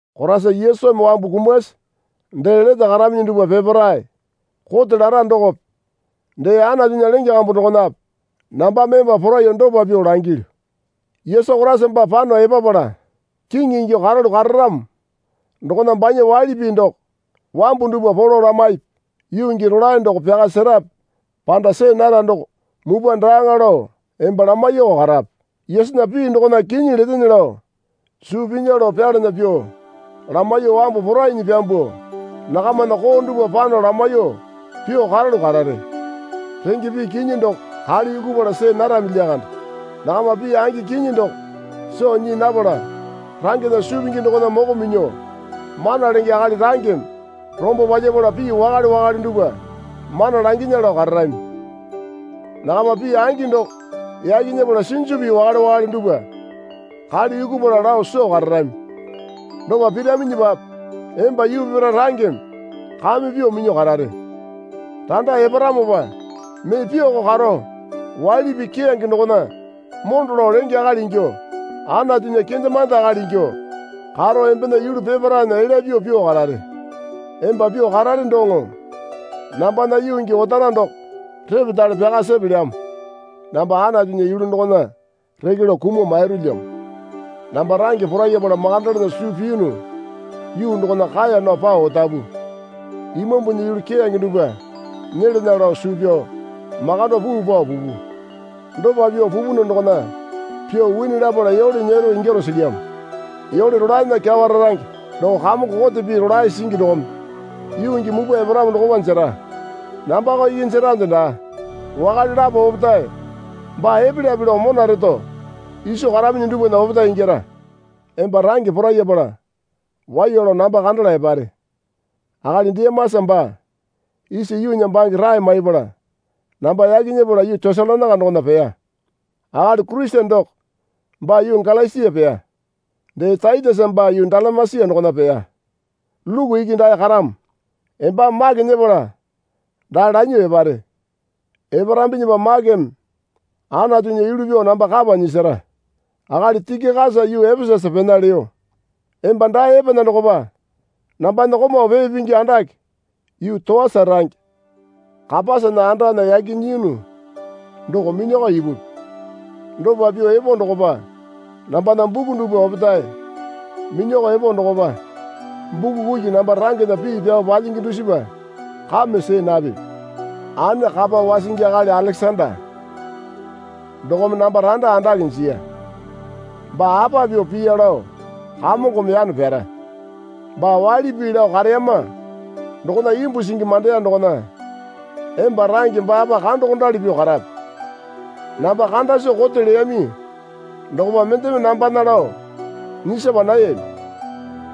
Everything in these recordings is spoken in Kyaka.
Koraisa Yesumi wambu kumasi dee lete karaminyi dupwa peparae kote lara dokope dee Anatunya lenge kambu dokonape nambame emba poraiyuo dopa pyuo langilyu. Yesu Koraisa baa pano epapala Kiŋi ingyuo karalu kararamo dokona banya waili pii doko wambu dupwa polo lamaipi. Yuu gii rolae doko pyaka serape panda see nara doko mupwa daaŋa lao emba lamaiyuoko karape. Yesunya pii dokona kinyi letene lao suu pinya lao pyalana pyuo lamaiyuo wambu porainyi pyambuo nakamana koo dupwa pano lamaiyuo pyuo karalu karare. Renge pii kinyi doko kale yukupala see narami lyakande. Nakama pii angi kinyi doko soo nyii napala rangena suu pingi dokona moko minyuo mana lenge akali rangeme rombo palyapala pii wakale wakale dupwa mana langinya lao kararami. Nakama pii angi doko yaki nyepala sinju pii wakale wakale dupwa kale yukupala lao soo kararami. Dopa piraminyipape emba yuu peparae rangeme kame pyuo minyuo karare. Randa eparamopa mee pyuoko karo waili pii keyange dokona mondo lao lenge akali ingyuo Anatunya kendemande akali ingyuo karo embena yulu peparaena elya pyuo pyuo karare. Emba pyuo karare doŋo nambana yuu gii otara doko repetale pyaka sepelyamo. Namba Anatunya yulu dokona reke lao kumuo mairulyamo. Namba range porayapala makandalana suu piyunu yuu dokona kaeya nao pao otapu. Imambunya yulu keyange dupwa nyelana lao suu pyao makando puu pao pupu. Dopa pyuo pupunu dokona pyuo wini lapala yole nyero ingyaro silyamo. Yole rolaena kyawa rarange doko Kamongo kote pii rolae singi dokome yuu gii mupwa eparamo dokopa jera. Nambako iki jerande daa. Wakale lapo opetae baa epelyape lao mona reto iso karaminyi dupwana opetae ingyara. Emba range porayapala waiya lao namba kandala epare. Akali Dimasa baa isa yuunya bange rae maipala namba yaki nyepala yuu Tesalonaika dokona peya. Akali Kurisene doko baa yuu Galasia peya. Dee Taitesa baa yuu Dalamesia dokona peya. Luku iki dae karamo. Embame Make nyepala dae lanyuo epare. Eparambinyipa Makeme Anatunya yulu pyuo namba kapa nyisara. Akali Tikikasa yuu Epesasa pena leyo. Emba dae epana dokopa nambana komau pee pingi andake yuu Toasa range Kapasana andana yaki nyiyunu doko minyakao ipupi. Dopa pyuo epo dokopa nambana buku dupwa opetae minyakao epo dokopa buku kuki namba rangena pii pyao palyingi dusipa kame see napipi. Ane kapa wasingi akali Alekesanda dokome namba randa andake jiya. Baa apa pyuo piya lao Kamongome yano pyara. Baa waili pii lao kareyama dokona imbu singi mandeya dokona emba range baapa kandokondali pyuo karape. Namba kanda soo kote leyami dokopa mendeme nambana lao nyisapa nayami.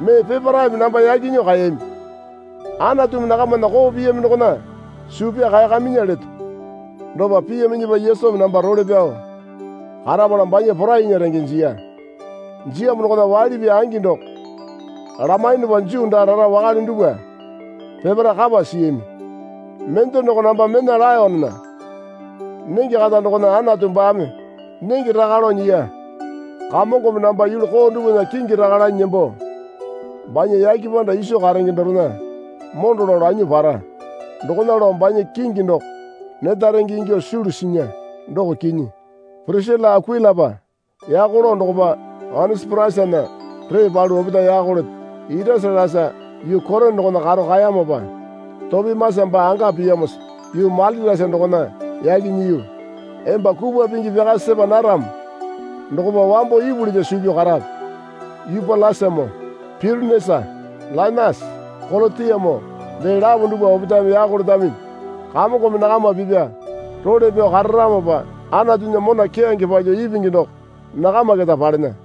Mee peparaeme namba yaki nyuo kaeyami. Anatumi nakamana koo piyami dokona suu pyao kaeyakaminya leto. Dopa piyaminyipa Yesumi namba role pyao karapala banya porainya renge jiya. Jiyamo dokona waili pii angi doko lamaiyunupa Juu daa rara wakale dupwa peparae kapa siyami. Mende doko namba mena laenena nenge kata dokona Anatu baame nenge raka lao nyiya. Kamongome namba yulu koo dupwana kingi raka lanyi nembo banya yake panda iso karenge dorena mondo lao lanyuo para. Dokona lao banya kingi doko neta renge ingyuo sulu sinya, doko kinyi. Pirisila Akuilapa yako lao dokopa Onesiporasana ree palu opetae yako leto. Irasatasa yuu Korina dokona karo kaeyamopa, Topimasa baa anga piyamosa yuu Mailitasa dokona yaki nyiyu. Emba kupwa pingi pyaka sepa naramo dokopa wambo ipulinya suu pyao karape. Yupyulasamoo, Pyutenesa, Lainasa, Kolotiamoo dee lapo dupwa opetaeme yako letaminyi. Kamongome nakama pipya role pyao kararamopa Anatunya mona keyange palyuo ipingi doko nakama keta palena.